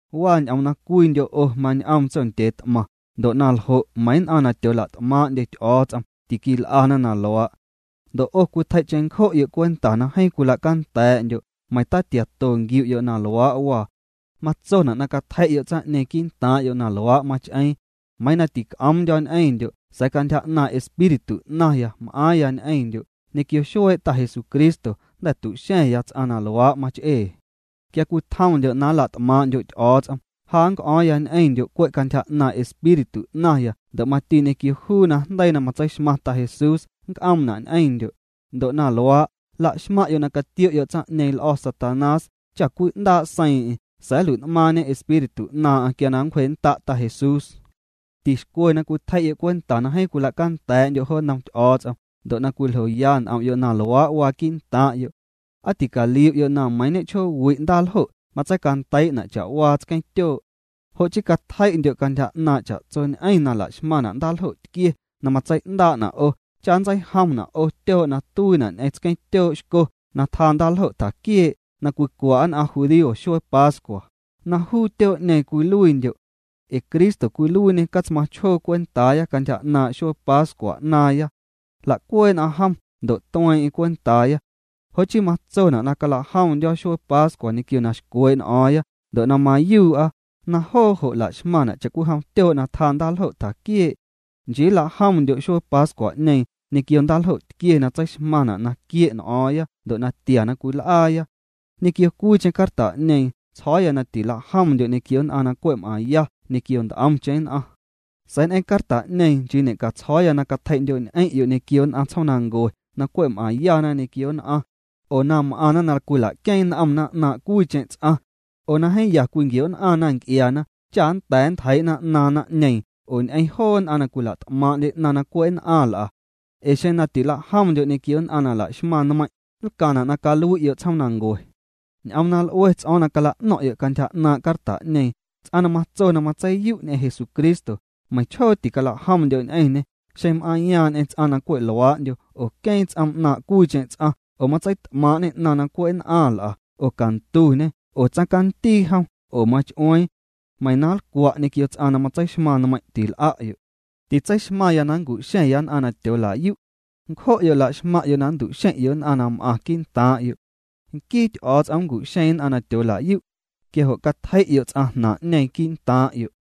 Waa ñ'oom na cwiindyo' 'o mañ'oom tsondyee t'maⁿ ndo' na ljo' meiⁿ nn'aⁿ na tyoola't'maaⁿ'ndye Ty'o̱o̱ts'om tiquil'ana na luaa'. Ndo' 'o cwitjei' cheⁿncjo'yo' cwenta na jeeⁿ cwila'canda̱a̱'ndyo' meiⁿ tatiato nquiu'yo' na luaa' waa. Matsona' na catjei'yo' tsaⁿ'ñeeⁿ quii'ntaaⁿ'yo' na luaa' mach'eeⁿ. Meiiⁿ na tic'o̱o̱ⁿndyo̱ ñ'eⁿndyo', sa̱a̱ cantyja 'naaⁿ' espíritu 'naⁿya m'aaⁿya ñ'eⁿndyo', ñequio xuee' Ta Jesucristo jnda̱ tu'xa̱ⁿya ts'aⁿ na luaa' mach'ee. Quia cwitjomndyo' na nla't'maaⁿ'ndyo' Ty'o̱o̱ts'om ja nnc'o̱o̱ⁿya ñ'eⁿndyo' cwe' cantyja 'naaⁿ' espíritu 'naⁿya ndo' mati ñequio juu najndeii na matseixmaⁿ Ta Jesús nnc'oomna' ñ'eⁿndyo'. Ndo' na luaa', la'xmaⁿ'yo' na catio'yo' tsaⁿ'ñeeⁿ l'o̱ Satanás cha cwi'ndaa' seiiⁿ'eⁿ sa̱a̱ nlui'n'maaⁿñe espíritu 'naaⁿ'aⁿ quia na nncwjee'nnda' Ta Jesús. Tixcwe na cwitjei'yo' cwenta na jeeⁿ cwila'canda̱a̱'ndyo' jo nnom Ty'o̱o̱ts'om ndo' na cwiljoya n'om'yo' na luaa' waa quii'ntaaⁿ'yo'. ¿Aa ticaliu'yo' na meiiⁿ ñechjoowi' ndaaljo' matseicandeii'na' cha'waa tsqueeⁿtyoo'? Jo' chii catjei'ndyo' cantyja 'naaⁿ' cha'tsoñ'eⁿ na la'xmaⁿna' ndaaljo' tquie na matsei'ndaa'na' 'o cha nntseijomna' 'o tyoo' na tuiina' ñ'eⁿ tsqueeⁿtyoo' xco na tjaa ndaaljo' tjaquiee' na cwicwa' nn'aⁿ judíos xuee Pascua, na juu tyoo'ñeeⁿ cwiluiindyo'. Ee Cristo cwiluiiñê Catsmaⁿ chjoo cwentaaya cantyja 'naaⁿ' xuee Pascua 'naaⁿya. Jla'cuee' nn'aⁿ jom ndo' tueeⁿ'eⁿ cwentaaya. Jo' chii matsona' na calajomndyo̱ xuee Pascua ñequio na xcwee' n'o̱o̱ⁿya ndo' na mayuu'a, na joo jo' la'xmaⁿna' cha'cwijom tyoo' na tjaa ndaaljo' tjaquiee'. Nchii nlajomndyo̱ xuee Pascua'ñeeⁿ ñequio ndaaljo' tquie na tseixmaⁿna' na quie' n'o̱o̱ⁿya ndo' natia na cwil'aaya. Ñequio cwiicheⁿ carta'ñeeⁿ tsjo̱o̱ya na tilajomndyo' ñequio nn'aⁿ na cwe' m'aⁿya ñequio nt'omcheⁿ nn'aⁿ. Sa̱a̱ ñ'eⁿ carta'ñeeⁿ nchii ñe'catsjo̱o̱ya na catjei'ndyo'ñ'eⁿ'yo' ñequio nn'aⁿ tsjoomnancue na cwe' m'aⁿyana ñequio nn'aⁿ oo na m'aⁿna na cwila'queeⁿ n'omna 'naaⁿ' cwiicheⁿ ts'aⁿ, oo na jeeⁿ ya cwinquio'nn'aⁿna nc'iaana cha nnda̱a̱ ntjeii'na 'naaⁿ naⁿ'ñeeⁿ oo ñ'eⁿ joo nn'aⁿ na cwila't'maaⁿ'ndye 'naⁿ na cwe' nn'aⁿ l'a. Ee xeⁿ tilajomndyo' ñequio nn'aⁿ na laxmaⁿ nmeiⁿ', nlcaⁿna' na calui'yo' tsjoomnancue. Ñ'oom na l'ue ts'o̱o̱ⁿ na cala'no̱ⁿ'yo' cantyja 'naaⁿ' carta'ñeeⁿ, ts'aⁿ na matso na matseiyu' ñ'eⁿ Jesucristo, meiⁿchjoo tilajomndyo' ñ'eⁿñê xeⁿ m'aaⁿyaaⁿ ñ'eⁿ ts'aⁿ na cwe' luaa'ndyo', oo queeⁿ ts'oom 'naaⁿ' cwiicheⁿ ts'aⁿ, oo matseit'maaⁿ'ñê 'naⁿ na cwe' nn'aⁿ l'a, oo cantuñê, oo tsaⁿ candii jom, oo mach'ueeⁿ. Meiⁿ na nlcwa' ñequio ts'aⁿ na matseixmaⁿ nmeiⁿ' til'a'yo'. Titseixmaⁿya na nncu'xa̱ⁿya nn'aⁿ na tyoola'yu'. Ncjo'yo' la'xmaⁿ'yo' na nntu'xeⁿ'yo' nn'aⁿ na m'aⁿ quii'ntaaⁿ'yo'. Nquii Ty'o̱o̱ts'om nncu'xeeⁿ nn'aⁿ na tyoola'yu'. Quia jo' catjei'yo' ts'aⁿ jnaⁿ'ñeeⁿ quii'ntaaⁿ'yo'.